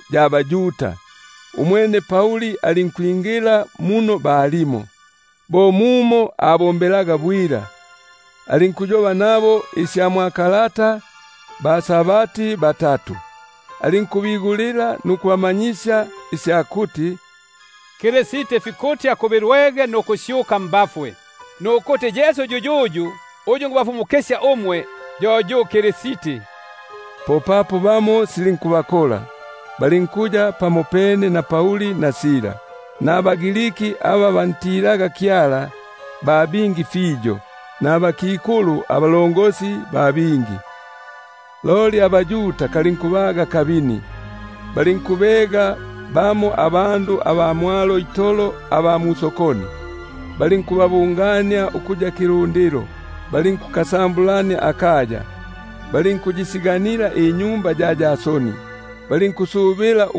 ya baYuda. Umwene Pauli alinkwingila muno balimo, bo mumo abombelaga bwila; alinkukanikana nabo isya mwa kalata baSabati batatu. Alinkubigulila nukubanangisya isya kuti: Kristi fikuti akubilwege nukusyuka mbafwe; nukuti: Yesu yuyuyu, uyu nikubafumukisya umwe, yo yu Kristi. Popapo bamo silinkubakola, balinkuya pamopene na Pauli na Sila, nabaGriki aba bantilaga Kyala ba bingi fiyo, nabakikulu abalongosi ba bingi. Loli abaYuda kalinkubaga akabini, balinkubega bamo abandu aba mwalo itolo aba musokoni, balinkubabungania ukuya Ifilundilo, balinkukasambulania akaya, balinkuyisiganila inyumba ya Yasoni, balinkulonda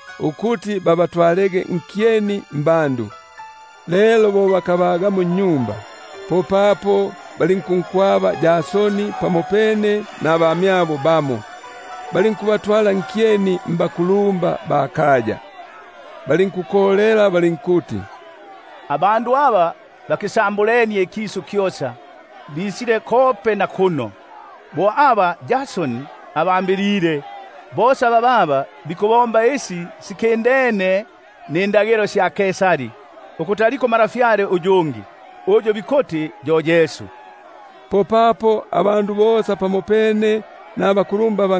ukubatwala nkyeni mbandu. Lelo bo bakabaga, popapo balinkunkwaba Yasoni nabamyabo bamo, balinkubatwala nkyeni nabakulumba ba kaya, balinkukolela balinkuti: Abandu aba bakisambulenie ikisu kyosa, bisile kope na kuno, bo aba Yasoni abambilile; bosa bababa bikubomba isi sikindene nindagilo sya Kaisari, bikuti aliko untwa uyungi, uyu bikuti yo Yesu. Popapo abandu bosa pamopene nabakulumba ba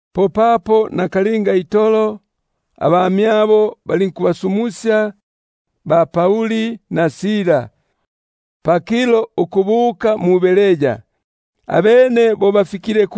Popapo nakalinga itolo abamyabo balinkubasumusya ba-Pauli na Sila pakilo ukubuka mu-Beroya, abene bo bafikile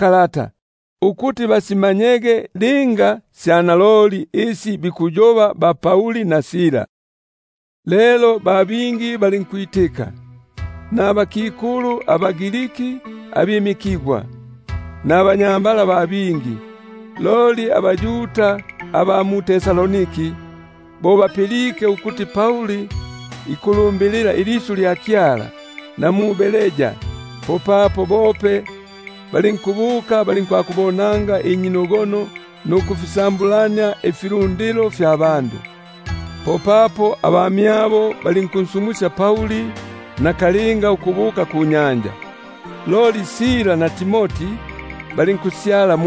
lata bwila itolo, ukuti basimanye linga bo sili. Lelo ba bingi balinkwitika, nabakikulu abaGriki abimikigwa, nabanyambala ba bingi. Loli abaYuda aba mu-Tesalonike, bo bapilike ukuti Pauli ikulumbilila ilisyu lya Kyala na mu-Beroya, popapo mope balinkubuka, balinkwakubonanga inyinogono nukufisambu- lania ifilundilo. Popapo abamyabo balinkunsumusya Pauli nakalinga ukubuka kunyanja; loli Sila na Timoti balinkusyala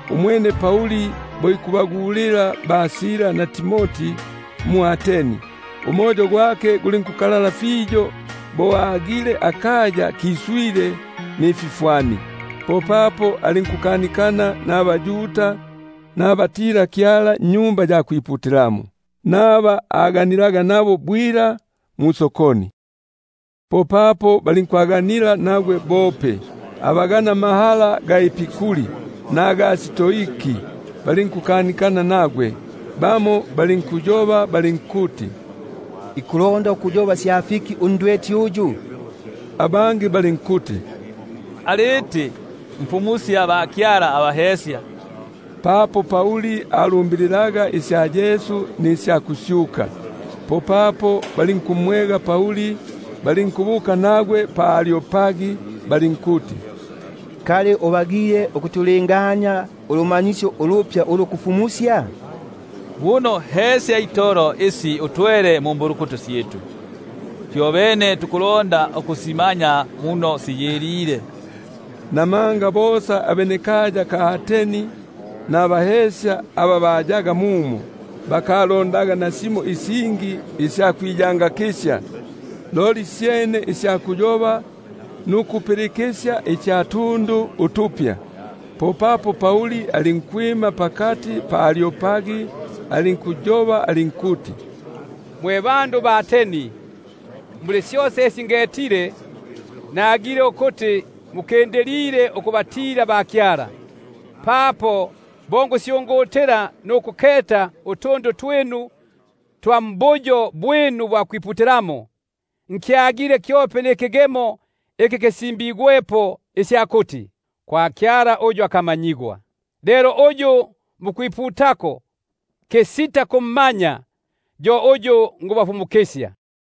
Umwene Pauli bo ikubagulila mwʼAteni, umoyo gwake gulinkukalala fiyo bo agile akaya kiswile nififwani. Popapo alinkukanikana mbaYuda nabatila Kyala mu-Sinagogi, naba aganilaga nabo bwila musokoni. Popapo balinkwaganila nagwe bope abaganamahala abaEpikuri nabaStoiki, bamo balinkuti: Ikulonda ukuyoba sya fiki undweti uyu? Abangi balinkuti: Aliti mfumusya bakyala abahesya. — Namanga alumbililaga isya Yesu nisya kusyuka. Popapo balinkumwega, balinkubuka nagwe pa Areopagi balinkuti: Kali ubagile ukutulingania ulumanyisyo ulupya ulu kulufumusya? Buno hesya itolo isi utwele mumbulukutu syitu; fyobene tukulonda ukusimanya muno siyilile. Namanga bosa abʼAteni nabahesya aba hayaga mumo, bakalondaga nasimo isingi isya kwiyangakisya, loli syene isya kuyoba nukupilikisya isya tundu utupya. Popapo Pauli alinkwima pakati pa Areopagi alinkuti: Mwe bandu ba Ateni, muli syosa isi ngetile, nagile ukuti mukindilile ukubatila bakyala; papo bo ngusyungutila nukufiketa ifi mukwiputako, nkyagile kyope nikigemo iki sisimbigwepo isya kuti: KWA KYALA UNSITA KUMANYIGWA. Lelo uyu mukwiputako kisita kummanya, yo uyu nikubafumukisya.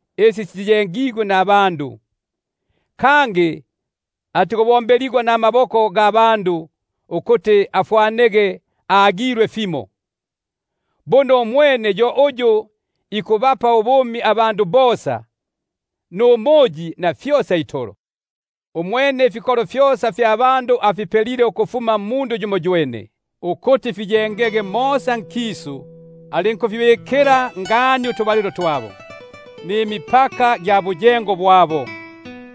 abayengigwa namaboko; kangi atikubombeligwa namaboko ga bandu, ukuti afwanege agilwe fimo; buno umwene yo uyu ikubapa ubumi bosa, numuyi, na fyosa itolo. Umwene ifikolo fyosa fya bandu afipelile ukufuma mmundu yumoywene, ukuti fiyengege posa pamwanya pakisu, alinkubabikila ngani utubalilo twabo, nimipaka gya buyengo bwabo,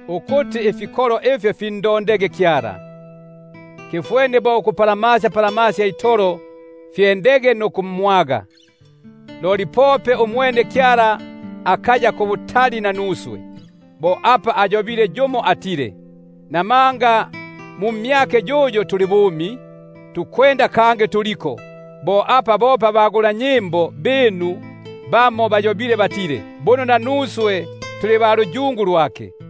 ukuti bandondege Kyala, nukuti pamo bapusanikege nukumwaga, napapo umwene akaya pabutali pali yumoyumo mmyitu. Namanga mu mmyake yuyo tuli bumi, tukwenda, kangi tuliko; bo apa bope abagulanyimbo binu bamo bayobile batile: Buno nanuswe tuli ba luyungu lwake.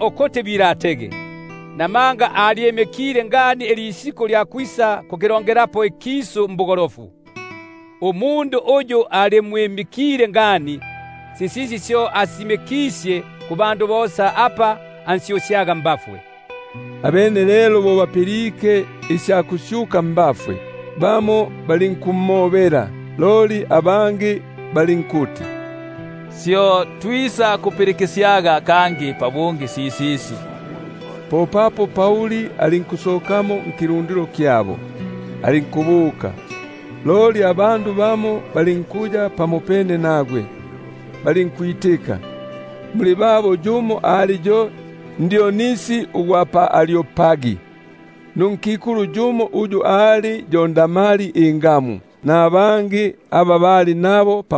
ukuti bapindukege, papo alyimikile ngani ilisiku ilya kwisakukilongelapo ikisu mbugolofu, mmundu uyu alimwimikile ngani. Sisisi syo asisisimikisye kubandu bosa apa ansyusyaga mbafwe. Abene lelo bo bapilike isya kusyuka mbafwe, bamo balinkumobela, loli abangi balinkuti: Syo twisakukupilikisyaga kangi pabungi sisisi. Popapo Pauli alinkusokamo nkilundilo kyabo, alinkubuka. Loli abandu bamo balinkuya pamopene nagwe, balinkwitika; muli babo alimo yope Dionisi ugwʼAreopagi, nunkikulu uyu ali yo Damari ingamu, nabangi aba bali nabo.